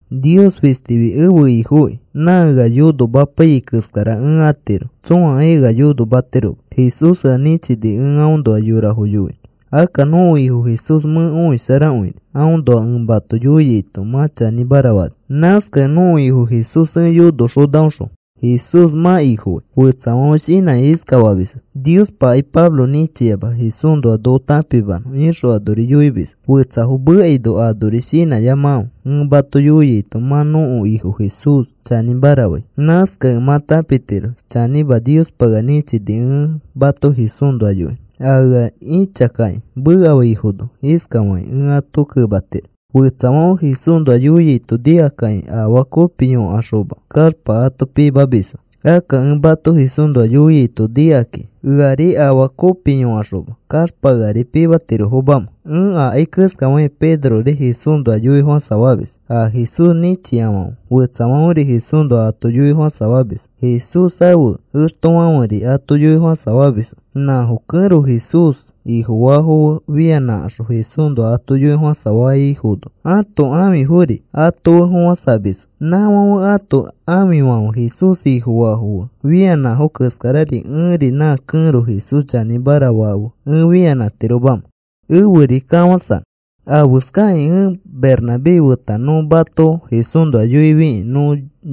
Nios fistifi ẽfe Ifokĩ. Nã ea yonomapaiyai keskara ẽ atiro. Tsõakai ea yonomatiroma. Jesús ea nĩchini ẽ aõnoa yorafo yoinõ. Akka nõko Ifo Jesús mẽ õisharakõini. Aõnoa ẽ mato yoiaito mã chanĩmara fani. Nãskakẽ nõko Ifo Jesús ẽ yonoxonaõxõ Jesús mã Ifofai. Fetsafãfe shinãkakĩ iskafamisfo: “Niospakai Pablo nĩchiama Jesúsnoa noko tãpimanõ,” ixõ anori yoimisfo. Fetsafo mekaino anori shinãyamakãfe. Ẽ mato yoiaito mã nõko Ifo Jesús chanĩmara fai. Nãskakẽ mã tãpitiro chanĩma Niospa ea nĩchini ẽ mato Jesúsnoa yoinõ. A ea ĩchakakĩ mekafaifono iskafakĩ ẽ ato kematiro: Fetsafãfe Jesúsnoa yoiaito nikakakĩ afaa kopi yõkaxoma kaxpa ato pimamisfo. Akka ẽ mato Jesúsnoa yoiaito nikakakĩ, ¿eari afaa kopi yõkaxoma kaxpa eari pimatirofomamẽ? Ẽ akai keskafakĩ Pedrori Jesúsnoa yoifofãsafamis. A Jesús nĩchiafãfe fetsafãferi Jesúsnoa ato yoifofãsafamisfo. Jesús ãfe extofãferi ato yoifofãsafamisfo. Nãfo kẽro Jesús Ifofaafo fe fianãkaxõ Jesúsnoa ato yoifofãsafaifono ãto ãfifori ato fe fofãsamisfo. ¿Nãfãfe ãto ãfifãfe Jesús Ifofaafo fe fianãfo keskari ẽri nã kẽro Jesús chanĩmara faa fe ẽ fianãtiromamẽ eferi kafãsanõ? ¿Afeskakĩ ẽ Bernabé feta nõ mato Jesúsnoa yoifikĩ nõ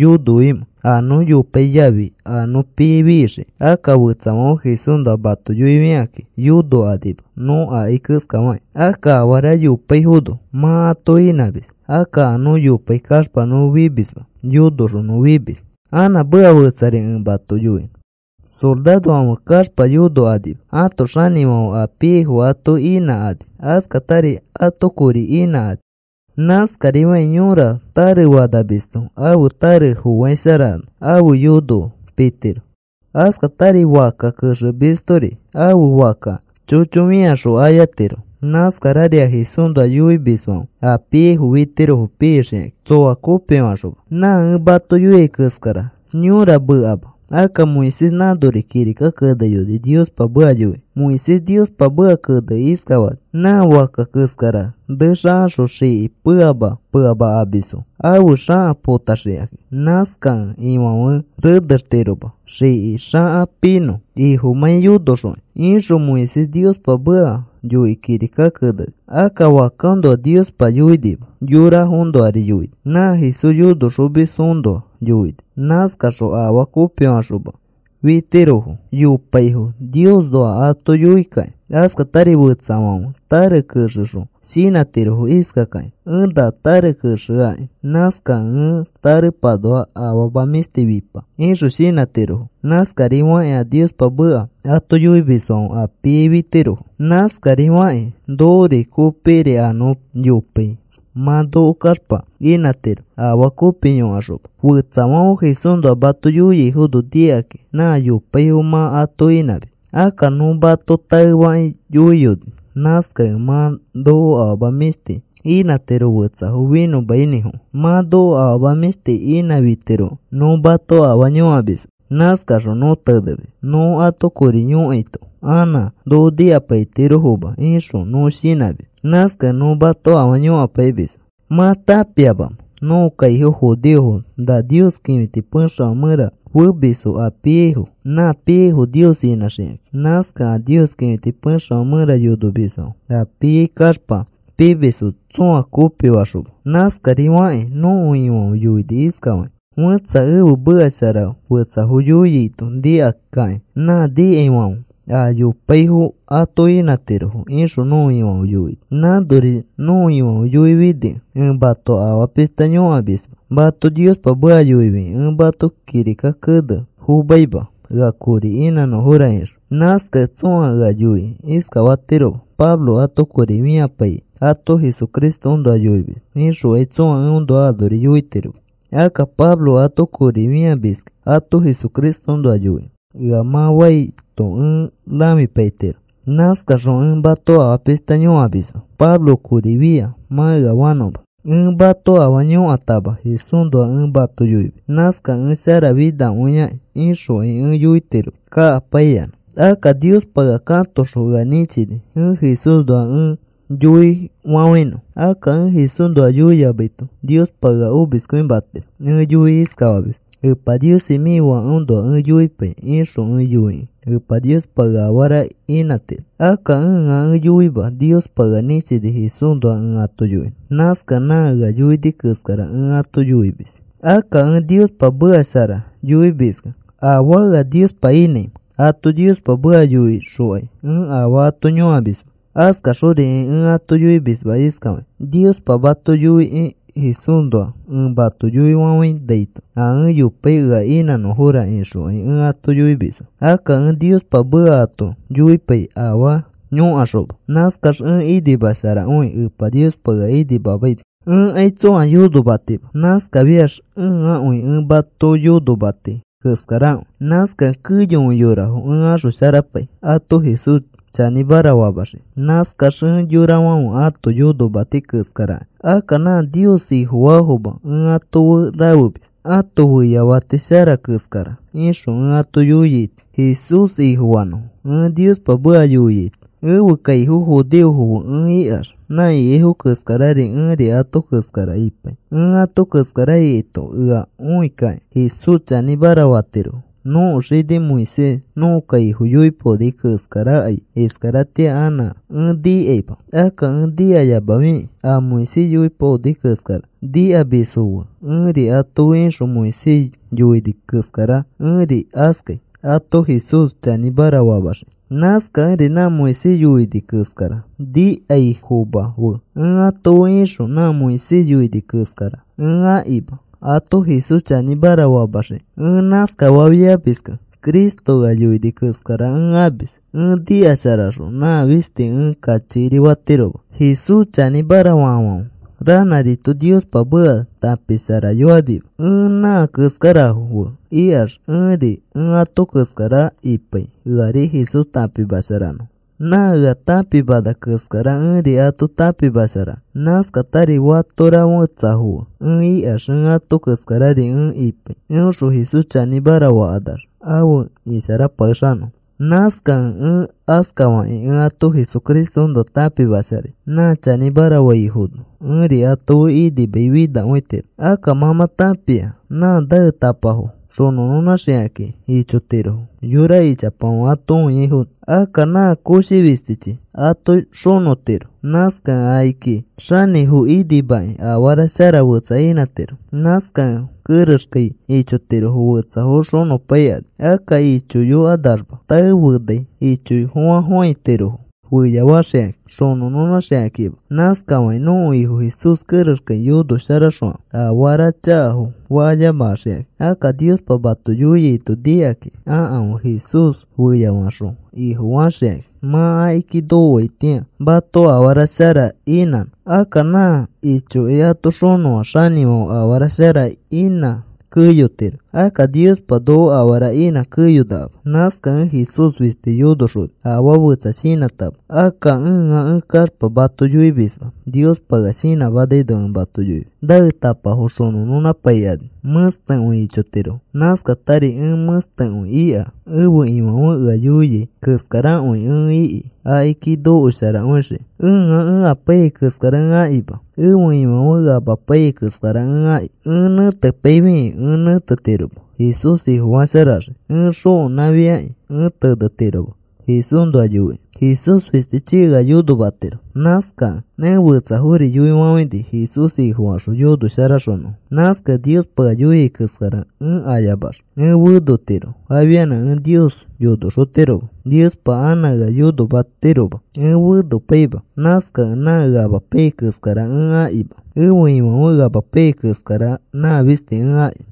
yonoimẽ, a nõ yopai yafi a nõ piai fixikĩ? Akka fetsafãfe Jesúsnoa mato yoifikakĩ yonokanima nõ akai keskafakĩ. Akka afara yopaifono mã ato inãmis. Akka a nõ yopai kaxpa nõ fimisma, yonoxõ nõ fimis. Anã meka fetsari ẽ mato yoinõ. Sorarofãfe kaxpa yonokanima. Ãto xanĩfãfe a piaifo ato inãkani. Askatari ato kori inãkani. Nãskarifakĩ yora tare fanamisto ãfe tare foaisharano ãfe yono pitiro. Askatari fakka kexemistori ãfe fakka chocho fĩaxõ ayatiro. Nãskarari a Jesúsnoa yoimisfãfe a piaifo fitirofo pixikakĩ tsõa kopifaxoma. Nã ẽ mato yoiai keskara yõra mekama. Akka Moisés nãnori kirika keneyoni Niospa meka yoikĩ. Moisés Niospa meka kenekĩ iskafani: “Nã fakka keskara nexakaxõ xiki peama peama amamisfo ãfe xaka potaxikakĩ. Nãskakẽ ifãfe renextiroma xiki xaka pinõ ifomãi yonoxokĩ,” ixõ Moisés Niospa meka yoikĩ kirika keneni. Akka fakkaõnoa Niospa yoinima. Yorafoõnoari yoini. Nã Jesús yonoxomisfoõnoa yoini. Nãskaxõ afaa kopifaxoma fitirofo yopaifo Niosnoa ato yoikakĩ. Askatari fetsafãfe tare kexexõ shinãtirofo iskakakĩ: “Ẽ na tare kexeakĩ nãskakẽ ẽ tarepanoa afama mĩshti fipa,” ixõ shinãtirofo. Nãskarifakĩ a Niospa meka ato yoimisfãfe a piai fitirofo. Nãskarifakĩ nokori kopikiri a nõ yopai mã noko kaxpa inãtiro afaa kopi yõkaxoma. Fetsafãfe Jesúsnoa mato yoiaifono nikakĩ nã yopaifo mã ato inãmis. Akka nõ mato taefakĩ yoiyoni. Nãskakẽ mã noko afama mĩshti inãtiro fetsafo finõmainĩfofã. Mã noko afama mĩshti inãfitirokẽ nõ mato afaa yõkamisma. Nãskaxõ nõ tenemis. “Nõ ato kori yõkaito anã noko nikapaitirofoma,” ixõ nõ shinãmis. Nãskakẽ nõ mato afaa yõkapaimisma. ¿Mã tãpiamamẽ? Nõko kaifo judeofo na Nios kĩfiti pexefã mẽra femisfo a piaifo. Nã piaifo Nios inãxikakĩ. Nãskakẽ a Nios kĩfiti pexefã mẽra yonomisfãfe a piai kaxpa pimisfo tsõa kopifaxoma. Nãskarifakĩ nõko Ifãfe yoini iskafakĩ: “Fẽtsa ẽfe meka shara fetsafo yoiaito nikakakĩ nã nikaifãfe a yopaifo ato inãtirofo,” ixõ nõko Ifãfe yoini. Nãnori nõko Ifãfe yoifinikẽ ẽ mato afaa pishta yõkamisma. Mato Niospa meka yoifikĩ ẽ mato kirika kene fomaima: “Ea kori inãnõfora,” ixõ. Nãskakẽ tsõa ea yoikĩ iskafatiroma: “Pablo ato kori fĩapaikĩ ato Jesucristoõnoa yoimis,” ixokai tsõa eõnoa anori yoitiroma. “Akka Pablo ato kori fĩamiski ato Jesucristoõnoa yoikĩ,” ea mã faito ẽ rãfipaitiro. Nãskaxõ ẽ mato afaa pishta yõkamisma: “Pablo kori fia,” mã ea fanõma. “Ẽ mato afaa yõkatama Jesúsnoa ẽ mato yoimis. Nãskakẽ ẽ sharafinakõiakĩ,” ixokai ẽ yoitiroma kakapaiyanã. Akka Niospa ea katoxõ ea nĩchini ẽ Jesúsõnoa ẽ yoifafãinõ. Akka ẽ Jesúsõnoa yoiyamaito Niospa ea omiskõimatiro. Ẽ yoikĩ iskafamis: “Epa Niosi, mĩ Fakeõnoa ẽ yoipai,” ixõ ẽ yoikẽ Epa Niospa ea afara inãtiro. Akka ẽa ẽ yoima. Niospa ea nĩchini Jesúsnoa ẽ ato yoinõ. Nãskakẽ nã ea yoini keskara ẽ ato yoimis. Akka ẽ Niospa meka shara yoimiskẽ, ¿afaa ea Niospa inãimẽ? Ato Niospa meka yoixokai ẽ afaa ato yõkamisma. Askaxorikai ẽ ato yoimisma iskafakĩ: “Niospa mato yoikẽ Jesúsnoa ẽ mato yoifafainaito a ẽ yopai ea inãnõfora,” ixokai ẽ ato yoimisma. Akka ẽ Niospa meka ato yoipai afaa yõkaxoma. Nãskax ẽ inimasharakõi Epa Niospa ea inimamaino. Ẽkai tsõa yonomatima. Nãskafiax ẽakõi ẽ mãto yonomati keskarakõi. Nãskakẽ keyokõi yorafo ẽ axosharapai ato Jesús chanĩmara famaxikĩ. Nãskax ẽ yorafãfe ãto yonomati keskaraki. Akka nã Nios Ifofaafoma ẽ ato fe rafemis ãto feyafati shara keskara ixõ ẽ ato yoiaito, Jesús Ifofanõfo ẽ Niospa meka yoiaito. Ẽfe kaifo judeofo fe ẽ ikax nã ikaifo keskari ẽri ato keskara ipai. Ẽ ato keskara ikaito ea õikakĩ Jesús chanĩmara fatirofo. Nõko xini Moisés nõko kaifo yoipaoni keskarakai iskaratĩa anã ẽ nikaima. Akka ẽ nikayamafikĩ a Moisés yoipaoni keskara nikamisfo fe ẽri ato fe ixõ Moisés yoini keskara ẽri askai ato Jesús chanĩmara famaxikĩ. Nãskakẽri nã Moisés yoini keskara nikaifoma fe ẽ ato fe ixõ nã Moisés yoini keskara ẽ akima ato Jesús chanĩmara famaxikĩ. Ẽ nãskafafiamiskẽ Cristo ea yoini keskara ẽ amis. Ẽ nikasharaxõ nã fisti ẽ kachikiri fatiroma. Jesús chanĩmara faafãfe ranãrito Niospa meka tãpisharayokanima. Ẽ nã keskarafo fe ikax ẽri ẽ ato keskara ipai eari Jesús tãpimasharanõ. Nã ea tãpimana keskara ẽri ato tãpimasharanõ. Nãskatari fatora fetsafo fe ẽ ikax ẽ ato keskarari ẽ ipai. Eõxõ Jesús chanĩmara fakanax afe isharapakexanõfo. Nãskakẽ ẽ askafakĩ ẽ ato Jesucristoõnoa tãpimasharai nã chanĩmara faifono ẽri ato fe inimai finakõitiro. Akka mã mã tãpia nã naetapafo xonõnõnãxikakĩ ichotirofo yora ichapafãfe ato õiaifono. Akka nã koshi fistichi ato xonõtiro. Nãskakẽ akiki xanĩfo inimakĩ afara shara fetsa inãtiro. Nãskakẽ kerexkai ichotirofo fetsafo xonõpaikani. Akka ichoyokanaxma tae fenai ichoyofofãfofãitirofo feyafaxikakĩ xokenãxikakima. Nãskarifakĩ nõko Ifo Jesús kerexkai yonosharaxokãfe afara chakafo fayamaxikakĩ. Akka Niospa mato yoiaito nikakĩ akãfe Jesús feyafaxõ Ifofaxikakĩ mã akiki nokoaitĩa mato afara shara inãnõ. Akka nã ichokĩ ato xonõa xanĩfãfe afara shara inã keyotiro. Akka Niospa noko afara inã keyonakama. Nãskakẽ ẽ Jesús fisti yonoxoni afaa fetsa shinãtama. Akka ẽa ẽ kaxpa mato yoimisma. Niospa ea shinãmanaino ẽ mato yoimis. Naetapafo xonõnõnãpaikani mẽstekõi ichotirofo. Nãskarari ẽ mẽstekõi ika. Ẽfe Ifãfe ea yoiai keskarakõi ẽ iki akiki nokosharaxiki. Ẽa ẽ apaiyai keskara ẽ akima. Ẽfe Ifãfe ea amapaiyai keskara ẽ aki. Ẽ tenepaifikĩ ẽ tenetiroma Jesús Ifofasharaxikĩ. Ẽ xokenãfiakĩ ẽ tenetiroma Jesúsnoa yoikĩ. Jesús fistichi ea yonomatiro. Nãskakẽ ẽ fetsafori yoifafãini Jesús Ifofaxõ yonosharaxonõfo. Nãskakẽ Niospa ea yoia keskara ẽ ayamax ẽ fenotiro, afianã ẽ Nios yonoxotiroma. Niospa anã ea yonomatiroma. Ẽ fenopaima. Nãskakẽ nã ẽa ẽ apaiyai keskara ẽ akima. Ẽfe Ifãfe ea amapaiyai keskara, nã fisti ẽ aki.